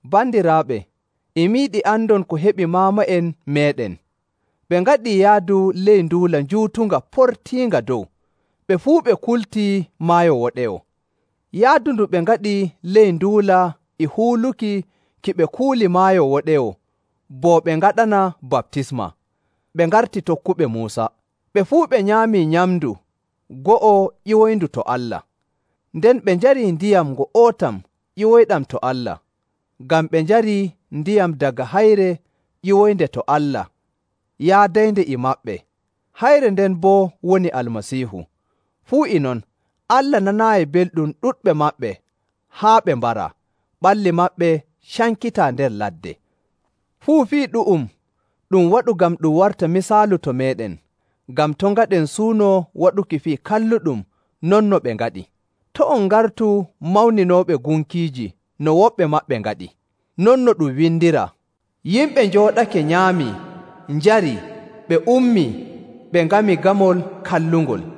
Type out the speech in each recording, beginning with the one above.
Bandiraaɓe, e mi yiɗi andon ko heɓi maama'en meeɗen. Ɓe ngaɗii yaadu ley nduula njuutunga portiinga dow, ɓe fuu ɓe kultii Maayo Woɗewo. Yaadu ndu ɓe ngaɗi ley nduula e huuluki ki ɓe kuuli Maayo Woɗewo bo ɓe ngaɗana baptisma, ɓe ngarti tokkuɓe Muusa. Ɓe fuu ɓe nyaamii nyamndu go'o ƴiwoyndu to Allah, nden ɓe njarii ndiyam ngo'otam ƴiwoyɗam to Allah. Ngam ɓe njarii ndiyam daga Hayre ƴiwoynde to Allah yaadaynde e maɓɓe. Hayre nden boo woni Almasiihu. Fuu e non Allah nanaayi belɗum ɗuɗɓe maɓɓe haa ɓe mbaraa, ɓalli maɓɓe cankitaa nder ladde. Fuu fii ɗu'um ɗum waɗu ngam ɗum warta misaalu to meeɗen, ngam to' ngaɗen suuno waɗuki fii kalluɗum non no ɓe ngaɗi. To' on ngartu mawninooɓe gunkiiji no woɓɓe maɓɓe ngaɗi. Non no ɗum windiraa, “Yimɓe njooɗake nyaamii, njarii, ɓe ummii, ɓe ngami gamol kallungol.”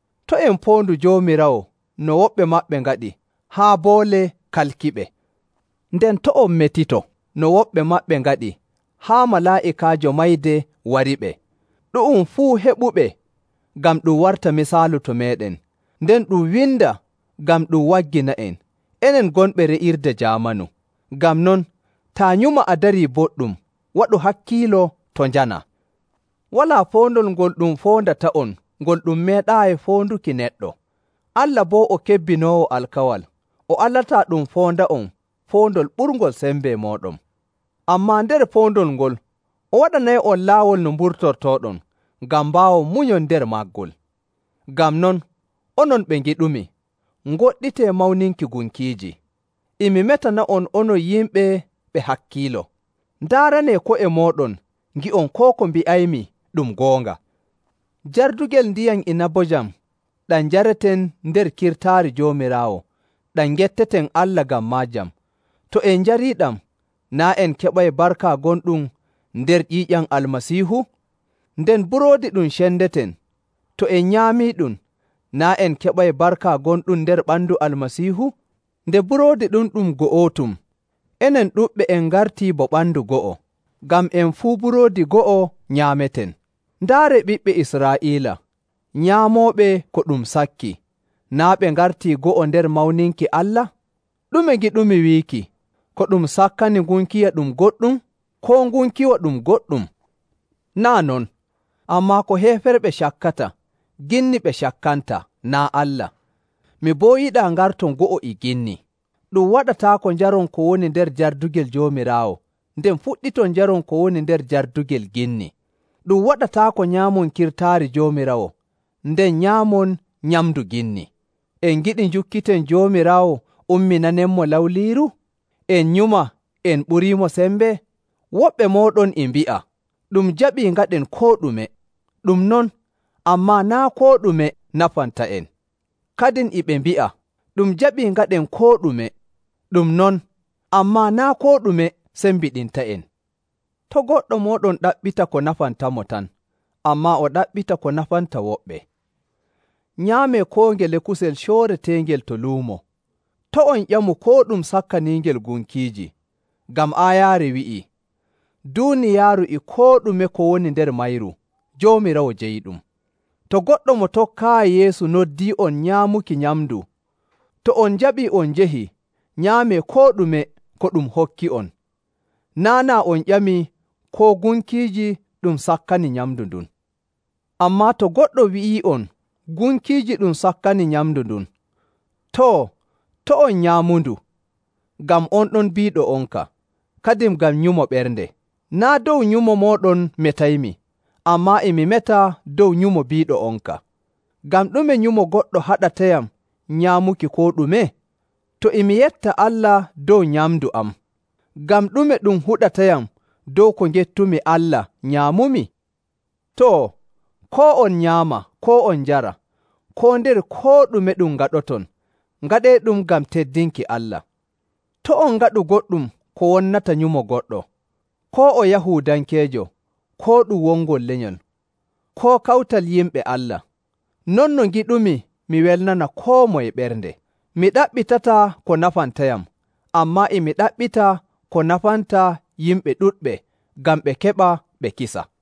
To' en poondu Joomiraawo no woɓɓe maɓɓe ngaɗi, haa boole kalkiɓe. Nden to' on metito no woɓɓe maɓɓe ngaɗi haa Malaa'ikaajo Mayde wariɓe. Ɗu'um fuu heɓuɓe ngam ɗum warta misaalu to meeɗen, nden ɗum windaa ngam ɗum waggina'en, enen gonɓe re'irde jaamanu. Ngam non, taa nyuma a darii boɗɗum, waɗu hakkiilo to' njanaa. Walaa poondol ngol ɗum foondata'on ngol ɗum meeɗaayi foonduki neɗɗo. Allah boo o kebbinoowo alkawal, o alataa ɗum foonda'on poondol ɓurngol sembe mooɗon. Ammaa nder poondol ngol, o waɗanay'on laawol no mburtortooɗon ngam mbaawon munyon nder maggol. Ngam non, onon ɓe ngiɗumi, ngoɗɗitee mawninki gunkiiji. E mi metana'on onon yimɓe ɓe hakkiilo. Ndaaranee ko'e mooɗon ngi'on koo ko mbi'aymi ɗum goonga. Jardugel ndiyam inabojam ɗam njareten nder kirtaari Joomiraawo ɗam ngetteten Allah ngam maajam, to en njariiɗam, naa' en keɓay barka gonɗum nder ƴiiƴam Almasiihu? Nden Buroodi ɗum cendeten, to en nyaamiiɗum, naa' en keɓay barka gonɗum nder ɓandu Almasiihu? Nde buroodi ɗum ɗum go'otum, enen ɗuɗɓe en ngartii bo ɓandu go'o, ngam en fuu buroodi go'o nyaameten. Ndaaree ɓiɓɓe Israa'iila; nyaamooɓe ko ɗum sakki, naa' ɓe ngartii go'o nder mawninki Allah? Ɗume ngiɗumi wiiki? Ko ɗum sakkani ngunkiwa ɗum goɗɗum? Koo ngunkiwa ɗum goɗɗum? Naa' non! Ammaa ko heeferɓe cakkata, ginni ɓe cakkanta, naa' Allah. Mi boo yiɗaa ngarton go'o e ginni. Ɗum waɗataako njaron ko woni nder jardugel Joomiraawo, nden fuɗɗiton njaron ko woni nder jardugel ginni. Ɗum waɗataako nyaamon kirtaari Joomiraawo, nden nyaamon nyamndu ginni. En ngiɗi njukkiten Joomiraawo umminanenmo lawliiru? En nyuma en ɓuriimo sembe? Woɓɓe mooɗon e mbi'a, “Ɗum jaɓii ngaɗen koo ɗume.” Ɗum non, ammaa naa' koo ɗume nafanta'en. Kadin e ɓe mbi'a, “Ɗum jaɓii ngaɗen koo ɗume.” Ɗum non, ammaa naa' koo ɗume sembiɗinta'en. To' goɗɗo mooɗon ɗaɓɓita ko nafantamo tan, ammaa o ɗaɓɓita ko nafanta woɓɓe. Nyaamee koo ngele kusel cooreteengel to luumo. To' on ƴamu koo ɗum sakkaniingel gunkiiji. Ngam aayaare wi'ii, “Duuniyaaru e koo ɗume ko woni nder mayru, Joomiraawo jeyiɗum.” To goɗɗo mo tokkaayi Yeesu noddii'on nyaamuki nyamndu, to on njaɓii on njahii, nyaamee koo ɗume ko ɗum hokki'on, naa' naa on ƴamii koo gunkiiji ɗum sakkani nyamndu ndun. Ammaa to goɗɗo wi'ii'on, “Gunkiiji ɗum sakkani nyamndu ndun,” too, to' on nyaamundu ngam on ɗon biiɗo'onka, kadin ngam nyumo ɓernde. Naa' dow nyumo mooɗon metaymi, ammaa e mi meta dow nyumo biiɗo'onka. Ngam ɗume nyumo goɗɗo haɗatayam nyaamuki koo ɗume? To e mi yetta Allah dow nyamndu am, ngam ɗume ɗum huɗatayam dow ko ngettumi Allah nyaamumi? Too, koo on nyaama koo on njara, koo nder koo ɗume ɗum ngaɗoton, ngaɗeeɗum ngam teddinki Allah. To' on ngaɗu goɗɗum ko wonnata nyumo goɗɗo, koo o Yahuudankeejo, koo ɗum wongol lenyol, koo kawtal yimɓe Allah, non no ngiɗumi mi welnana koo moye ɓernde. Mi ɗaɓɓitataa ko nafantayam, ammaa e mi ɗaɓɓita ko nafanta yimɓe ɗuɗɓe, ngam ɓe keɓa ɓe kisa.